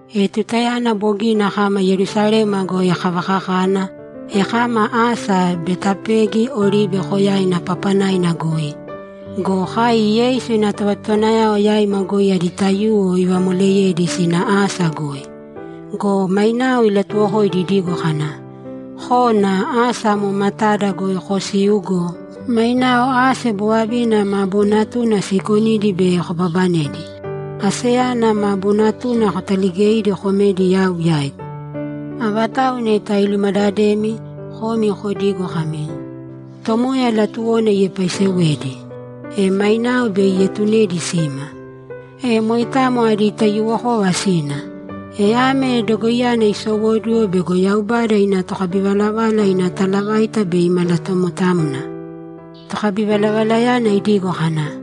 E tutayana bogina kama Yerusalema goi kavakakana, e kama asa Betapegi Oribe Koyaina papanaina goi. Go kai Yeisu ina tovatotowanayao yaima goi adi taiyuwo ivamoleyedi sina asa goi. Go mainao ilatuwokoidi idigo kana, ‘Kōna asa amo matada goi kosīu go, mainao ase bovavina ma boonatuna siikonidi bei kobabanedi. Aseyana ma bonatuna kotaligēidi komēdi yau yaigu. Avatau neta ilumadademi, komi kodīgo kami, “Tomoya latuwona iepaisewedi.” E mainao bei ietunedi sima.’ E moitamo adi taiyuwokova sina. E ame dogoiyana isowóduwo bego Yaubada ina tokabivalavala ina talavaita bei imalatomotamna. Tokabivalavalayana idigo kana,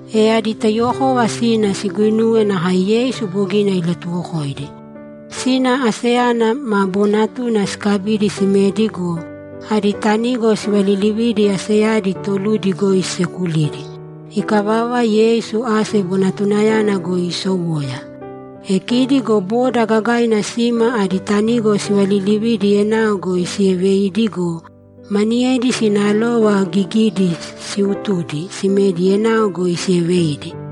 E adi taiyuwokova sina siguinuwe nakae Yeisu bogina ilatuwokoidi. Sina aseyana ma boonatuna sikabidi simedi go, adi tanigo sivalilividi aseyadi toludi goi sisekulidi. Ikavava, Yeisu ase bonatunayana goi isowoya. E kidi go boda gagaina sima adi tanigo sivalilividi enao goi sieveidi go, maniyedi sina alova gigidi siutudi simedi enao goi sieveidi.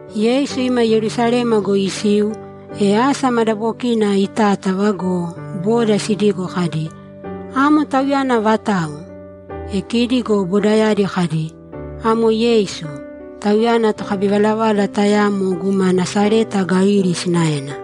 Yeisu ima Yerusalema goi isiu, e asa madabokina itátava go, boda sidigo kadi, ‘Amo Tauyana vatau?’ E kidi go bodayadi kadi, ‘Amo Yeisu; Tauyana tokabivalavala tayamo guma Nasareta Galili sinaena.’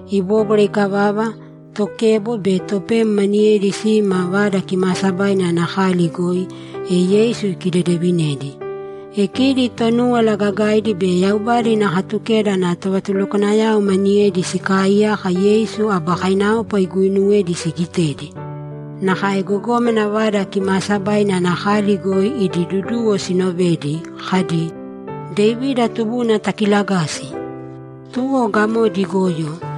Ibóbwara ikavava, tokebo be topem maniyedi sima Vada Kimaasabaina ana kali goi, e Yeisu ikidedevinedi. E kidi Tonúwala Gagaidi be Yaubada ina Katukeda ana tovatulukwanayao maniyedi sikaaiyaka Yeisu aba kainaopa iguuinuwedi sigitedi. Nakae gogómana Vada Kimaasabaina ana kali goi idi duduwo sinovedi kadi, ‘Devida Tubuna takilagāsi!’ Tuwo gamodi igoyo,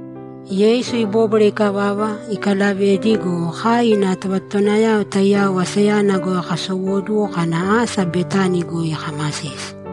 Yeisu ibóbwara ikavava, ikalavedi go, kai ina tovatotowanayao taiyao asayana goi kasowóduwo kana asa Betani goi kamasisi.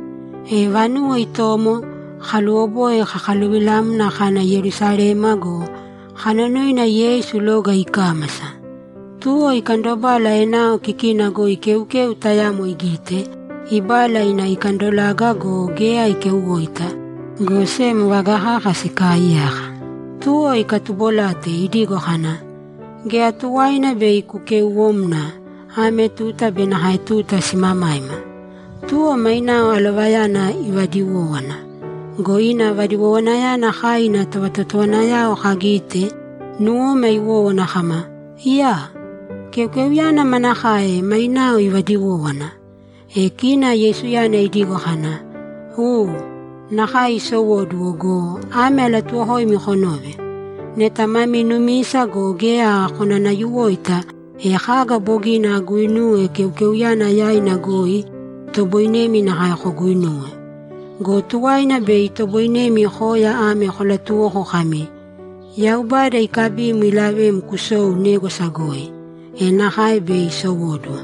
E vanuwo itomo, kaluwoboi kakaluvilamna kana Yerusalema go, kanonoina Yeisu loga ikámasa. Tuwo ikandobala enao kikina goi keukeu tayamo igite, ibala ina ikandolaga go, geya ikeuwoita, go sem vaga kaka sikaaiyaka. Tuwo ikatubolate idigo kana, ‘Geya tuwaina bei kukeuwōmna, ame tuta be nakae tuta simamaima!’ Tuwo mainao alovayana ivadiwówana. Go ina vadiwowanayana kai ina tovatotowanayao kagite, nuwoma iwówana kama, ‘Iyaa! Keukeuyana manakae mainao ivadiwówana?’ E kina Yeisuyana idigo kana, ‘U, nakae isowóduwo go, ame alatuuwokoimi konōve: Neta mami numisa go, geya konanayuwoita, e kaga bogina aguinuwe keukeuyana yaina goi, itoboinemi nakae koguinuwe. Go tuwaina bei itoboinemi koya ame kolatuwoko kami, “Yaubada ikabim ilavem kusōu négwasa goi.” E nakae bei isowóduwo.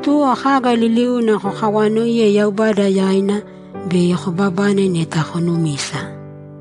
Tuwo kaga liliuna kokawaanoiye Yaubada yaina, bei kobabane neta konumisa.’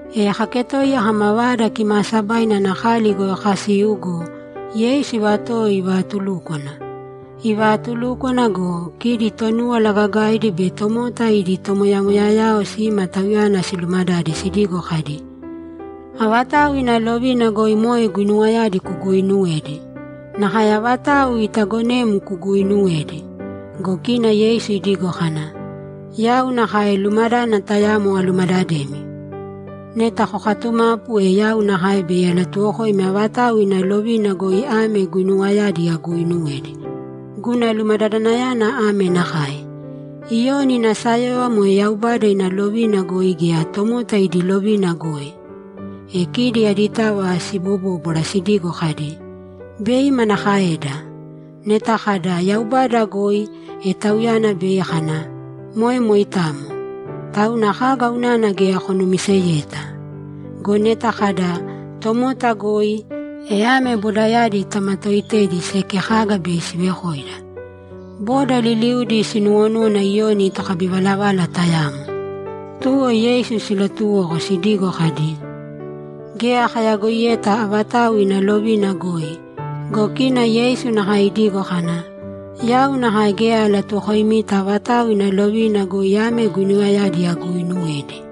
E kaketoiya kama Vada Kimaasabaina ana kali goi kasiu go, Yeisu ivatowo ivatulúkwana. Ivaatulúkwana go, kidi Tonúwala Gagaidi be tomota idi tomoyamoyayao sima Tauyana silumadade sidigo kadi, ‘Avatau ina lovina goi moe guinuwayadi kuguuinuwedi? Nakae avatau itaagonem kuguuinuwedi?’ Go kina Yeisu idigo kana, ‘Yau nakae lumadádana tayamo alumadademi. Neta kokatumapu, e yau nakae bei alatuwokoimi avatau ina lovina goi ame guinuwayadi aguuinuwedi. Guna lumadadanayana ame nakae: Iyoni ina sayóyova moe Yaubada ina lovina goi gea tomota idi lovina goi?’ E kidi aditava sibobóbwara sidigo kadi, ‘Bei manakaeda? Neta kada, “Yaubada goi”, e Tauyana bei kana, “Moe moitamo! Tauna kaga unana geya konumiseyeta?” Go neta kada, “Tomota goi”, e ame bodayadi tamatooitedi seki kaga bei sivekoida. Boda liliudi sinuwonúwana Iyoni tokabivalavala tayamo.’ Tuwo Yeisu silatuwoko sidigo kadi, ‘Geya kayagoiyeta avatau ina lovina goi.’ Go kina Yeisu nakae idigo kana, ‘Yau nakae geya alatuwokoimita avatau ina lovina goi ame guinuwayadi aguuinuwedi.’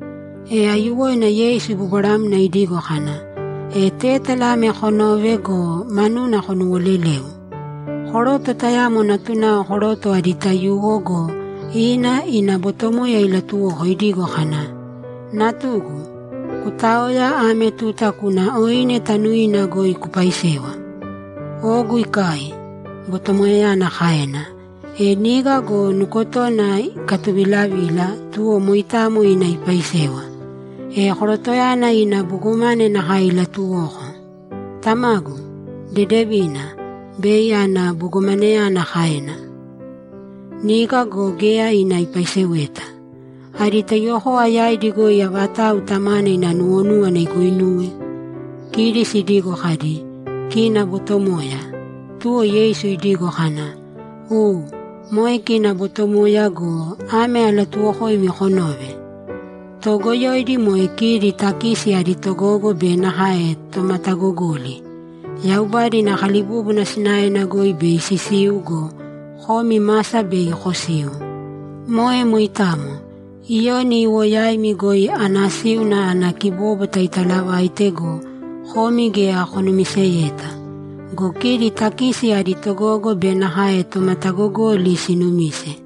E aiyuwoina Yeisu ibobwaramna idigo kana, ‘E tétala ame konōve go, manuna konuwolelēu: Koroto tayamo natunao koroto adi taiyuwo go, ina ina botomoya ilatuwoko idigo kana, “Natugu, kutāoya, ame tuta kūna oine tanuina goi kupaisēwa.” “Ogu ikai”, botomoyayana kaena. E niga go nukotona ikatuvilavila, tuwo moitamo ina ipaisewa. E korotoyana ina bogomane nakae ilatuwoko. “Tamagu, dedevina. Bei ana”, bogomaneyana kaena. Niga go geya ina ipaiseweta. Adi taiyuwokova yaidi goi avatau tamana ina nuwonúwana iguinuwe?’ Kidi sidigo kadi, ‘Kina botomoya.’ Tuwo Yeisu idigo kana, ‘U, moe kina botomoya go, ame alatuuwokoimi konōve: Toogoyoidi, moe kidi takisi adi togogo be nakae tomatagogoli, Yaubada ina kalibúbuna sinaena goi bei sisiu go, komi masa bei kosiu. Moe moitamo. Iyoni iwo yaimi goi anasíuna ana kibóbwata italavaite go, komi geya konumiseyeta. Go kidi takisi adi togogo be nakae tomatagogoli sinumise.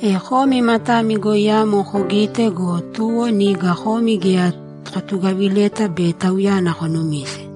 E komi matami goi amo kogite go, tuwo niga komi geya kotugavileta be tauyana konumise.’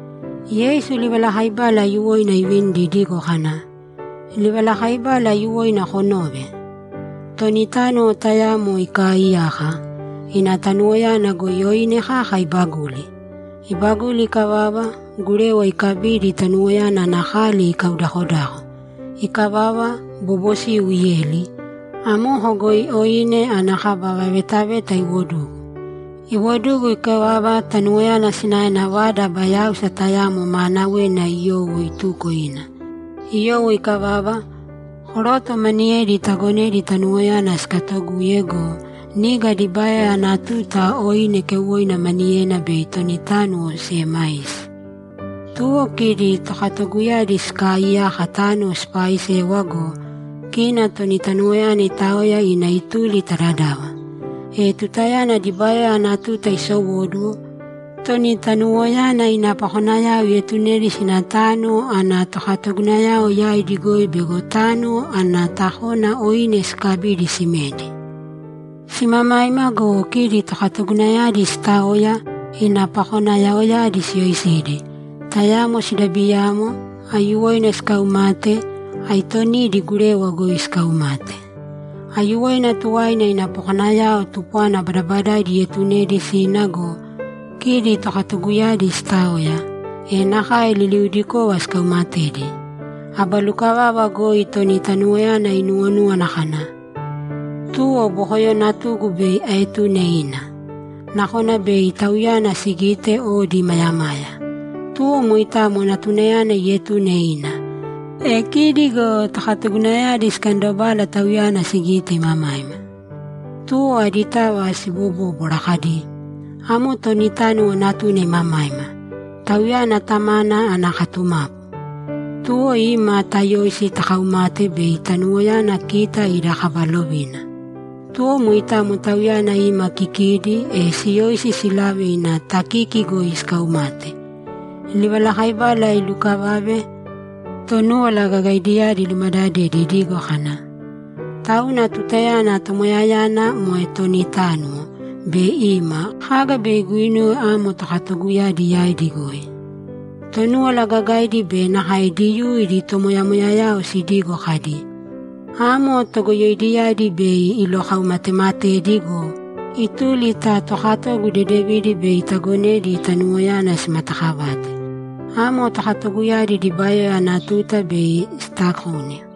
Yeisu livalakaibala aiyuwoina ivinidi idigo kana, ‘Livalakaibala aiyuwoina konōve. Toni tánuwo tayamo ikaaiyaka. Ina tanuwoyana goi oine kaka ibaguli. Ibaguli ikavava, gurewa ikabidi tanuwoyana ana kali ikaudakodako. Ikavava, bobosiu ieli. Amoko goi oine ana kaba vavetaveta iwodugu. Iwodugu ikavava, tanuwoyana sinaena vada aba yáusa tayamo maanawena iyowo ituko ina. Iyowo ikavava, koroto maniyedi itagonedi tanuwoyana sikatoguye go, niga dibayoya ana tuta oine keuwoina maniyena bei toni tánuwo siemaisi. Tuwo kidi tokatoguyadi sikaaiyaka tánuwo sipaaisewa go, kina toni tanuwoyana itaoya ina ituli ta dadava. E tutayana dibayoya ana tuta isowóduwo, toni tanuwoyana ina pakonayao ietunedi sina tánuwo ana tokatoguyao yaidi goi bego tánuwo ana takona oine sikabidi simedi. Simamaima go, kidi tokatoguyadi sitaoya, ina pakonayaoyadi siyoisidi, tayamo sidabiyamo, aiyuwoina sikaumate, aitonidi gurewa goi sikaumate. Aiyuwoina tuwaina ina pakonayao tupwana badabadaidi ietunedi sina go, kidi tokatoguyadi sitaoya, e nakae liliudikova sikaumatedi. Aba lukavava goi toni tanuwoyana inuwonúwana kana, “Tuwo bokoyo natugu bei aetune ina. Nakona bei tauyana sigite odi imayamaya.” Tuwo moitamo natunayana ietune ina. E kidi go tokatoguyadi sikandobala tauyana sigite imamaima. Tuwo aditava sibobóbwara kadi, “Amo toni tánuwo natuna imamaima. Tauyana tamana ana katumapu. Tuwo ima, tayōisi takaumāte bei tanuwoyana kita ida kaba lovina.” Tuwo moitamo tauyana ima kikidi, e siyoisi silave ina takiki goi sikaumate.’ Livalakaibala ilukavave, Tonúwala Gagaidiyadi ilumadadedi idigo kana, ‘Tauna tutayana tomoyayana, moe toni tánuwo, bei ima, kaga bei iguinuwe amo tokatoguyadi yaidi goi?’ Tonúwala Gagaidi be nakae Diyuu idi tomoyamoyayao sidigo kadi, ‘Amo togoyoidiyadi bei ilokaumatematedi go, ituli ta tokatogu dedevidi bei itagonedi tanuwoyana simatakavate. Amo tokatoguyadi dibayoya ana tuta bei sitakona.’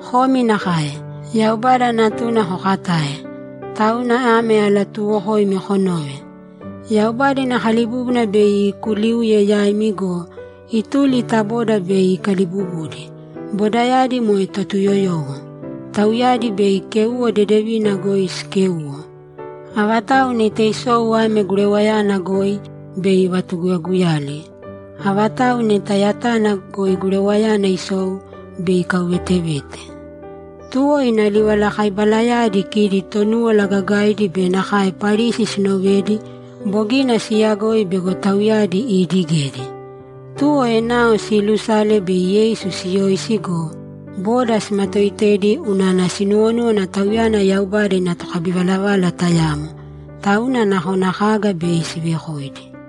Komi nakae. Yaubada Natuna kokatae. Tauna ame alatuuwokoimi konōve: Yaubada ina kalibúbuna bei ikuliuye yaimi go, ituli ta boda bei ikalibubudi, bodayadi moe Totuyoyowo. Tauyadi bei kéuwo dedevina goi sikéuwo. [ Avatau neta isou ame gurewayana goi, bei ivatuguguyali. Avatau neta yatana goi gurewayana isou, bei ikauvetevete.]’ Tuwo ina livalakaibalayadi kidi Tonúwala Gagaidi be nakae Parisi sinovedi, bogina siiyagoi bego tauyadi iidigedi. Tuwo enao siilusala bei Yeisu siyoisi go, boda simatoitedi unana sinuwonúwana Tauyana Yaubada ina tokabivalavala tayamo, tauna nakona kaga bei sivekoidi.